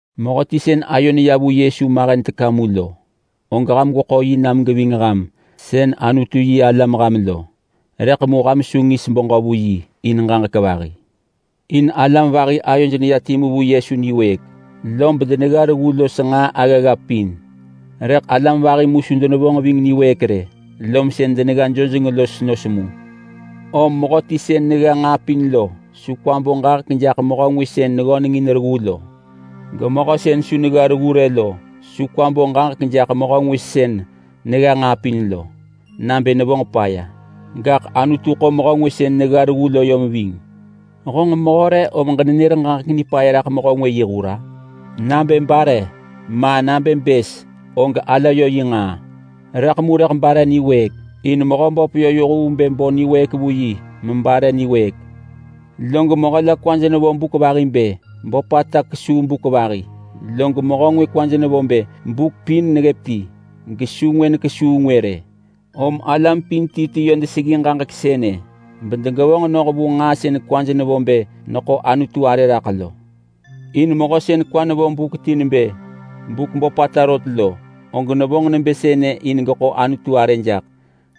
Mehöti sën ayo neya vu Yesu mahen teka mu lo, og ham gweḳo yi nam geving ham sën Anutu-yi-alam ham lo. Rëḳ mu ham su ngis beġö vu yi in ġaġek vahi. In alam vahi ayoj neya timu vu Yesu niwëëk, lob denegga reggu los nġaa aggagga pin. Rëḳ alam vahi mu su denevonġ ving niwëëk rë, lom sën denegga jojeng los nos mu. Om mehöti sën negga nġaa pin lo su kwa bo ġaġek jaḳ mehö ngwë sën neggöneng in reggu lo. Gemehö sën su negga reggu rë lo su kwa bo ġaġek jaḳ mehö ngwë sën negga nġaa pin lo nabë nevonġ paya. Gaḳ Anutu ḳo mehö ngwë sën negga reggu lo yom ving. Honġ mehö re om ġenenër ġaġek nipaya raḳ mehö ngwë yi hur-a? Nabë bare, ma nabë bës, og ala yö yi nġaa. Rëḳ mu rëḳ bare niwëëk. In Mehöböp yö yoh vu bë bo niwëëk vu yi mebare niwëëk. Log mehö la kwaj nevo buk vahi bë böpata rot kesuu buk vahi. Log mehö ngwë kwaj nevo bë buk pin neggëp ti gesu ngwë kesuu ngwë rë. Om alam pin ti ti yö deseggi ġaġek sënë bedegevonġ noh vu nġaa sën kwaj nevo bë neḳo Anutu arë raḳ lo. In mehö sën kwa nevo buk ti nebë buk böpata rot lo, og nevonġ nebë sënë in geḳo Anutu arë jaḳ.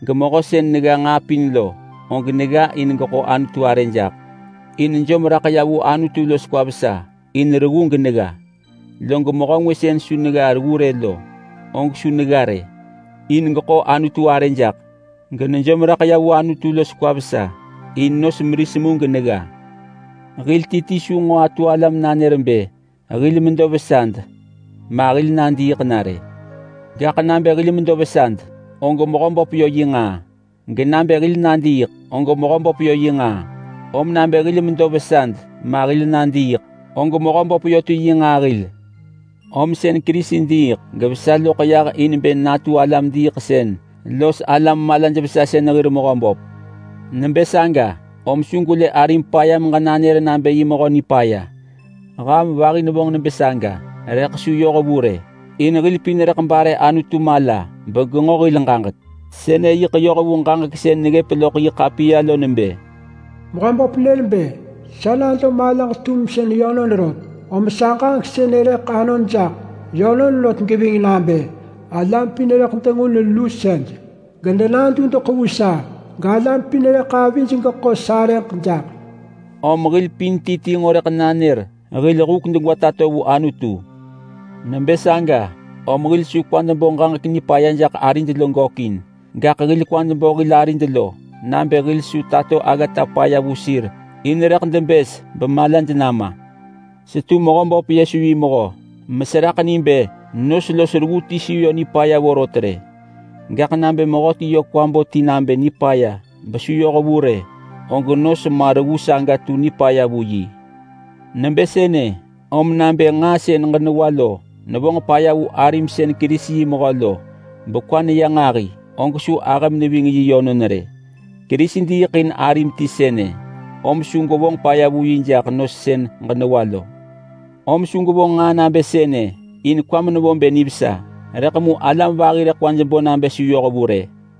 Gemehö sën negga nġaa pin lo, og negga in geḳo Anutu arë jaḳ. In nejom raḳ ya vu Anutu los kwa vesa in reggu genegga. Log mehö ngwë sën su negga reggu rë lo, og su negga rë in geḳo Anutu arë jaḳ. Genejom raḳ ya vu Anutu los kwa vesa in nos meris mu genegga. Hil ti ti su nġo atu ala menanër bë hil medo vesad ma, hil nadiiḳ na rë. Gaḳ nabë hil medo vesad, og Mehöböp yö yi nġaa. Genabë hil nadiiḳ, og Mehöböp yö yi nġaa. Om nabë hil medo vesad ma hil nadiiḳ, og Mehöböp yö ti yi nġaa hil. Om sën Kerisi diiḳ gevesa loḳ yah in bë natu alam diiḳsën los malaj-vesasën hir Mehöböp. Nebë saga, om su gwelë arim paya meġenanër nabë yi mehö nipaya. Ham vahi nevonġ nebë saga rëḳ su yoh vu rë, in hil pin rëḳ bare Anutu mala begenġo hil ġaġek. Sënë yiḳ yoh vu ġaġek sën neggëp loḳ yi ḳapiya lo nebë: “Mehöböp nër bë, ‘Sa nado malaġ-tumsën yönon rot, om sa ġaġek sënë rëḳ anon jaḳ yönon rot geving nabë: Alam pin rëḳ dengun lusej gedenadudeḳ vu sa, galam pin rëḳ avij geḳo sarëġ jaḳ.’” Om hil pin ti ti nġo rëḳ nanër hil huk degwa tato vu Anutu. Nebë saga, om hil su kwad bo ġaġek nipaya jaḳ arid lo gökin. Gaḳ hil kwad bo hil arid lo nabë hil su tato aggata paya vu sir in rëḳ debës bemalaj nama. Setu Mehöböp Yesu yi mehö meseraḳ ni bë nos los reggu ti su yö nipaya vorot rë. Gaḳ nabë mehöti yö kwa bo ti nabë nipaya besu yohvu rë, og nos ma reggu saga tu nipaya vu yi. Nebë sënë om nabë nġaa sën ġenewa lo nevonġ paya vu arim sën Kerisi yi mehö lo bekwa neya nġahi, og su ahëm neving yi yönon rë. Kerisi diiḳ in arim ti sënë, om su gwevonġ paya vu yi jaḳ nos sën ġenewa lo. Om su gwevonġ nġaa nabë sënë, in kwam nevo bë nivesa, rëḳ alam vahi rëḳ kwaj bo nabë su yohvu rë.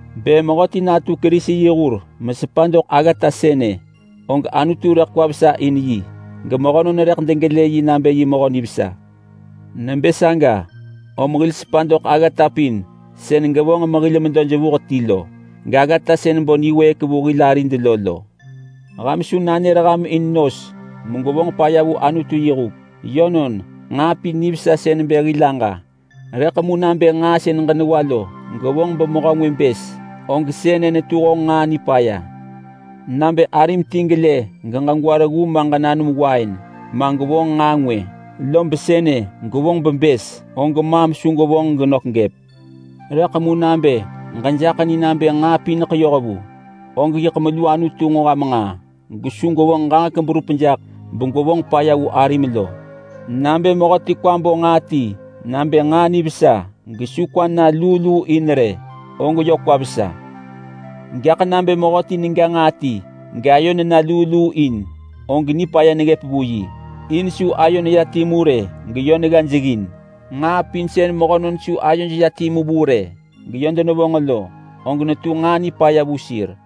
Bë mehöti natu Kerisi yi hur mesepa doḳ aggata sënë, og Anutu rëḳ kwa vesa in yi gemehönon rëḳ degelë yi nabë yi mehö nivesa. Nebë saga om hil sepa doḳ aggata pin sën gevonġ mehil medo jevuh ti lo, gaggata sën bo niwëëk vu hil arid lo lo. Ham su nanër ham in nos megwevonġ paya vu Anutu yi huk. Yönon, nġaa pin nivesa sën bë hil aġa. Rëḳ mu nabë nġaa sën ġenewa lo gevonġ bemehö ngwë bës, og sënë netu honġ nġaa nipaya. Nabë arim ti gelë geġegwa reggu ma ġenanum wain ma, gwevonġ nġaa ngwë, lob sënë gevonġ bebës, og maam su gwevonġ genök gëp. Rëḳ mu nabë ġejaḳ ni nabë nġaa pineḳ yohvu, og yiḳ melu Anutu nġo ham nġaa gesu gwevonġ ġaġek berup jaḳ begwevonġ paya vu arim lo. Nabë mehöti kwa bo nġaa ti nabë nġaa nivesa gesu kwa na luu luu in rë, og yö kwa vesa. Gaḳ nabë mehöti nega nġaa ti gayo nena luu luu in, og nipaya neggëp vu yi. In su ayo neya timu rë geyö gga jeggin. Nġaa pin sën mehönon su ayoj ya timu vu rë geyö denevonġ lo, og netu nġaa nipaya vu sir.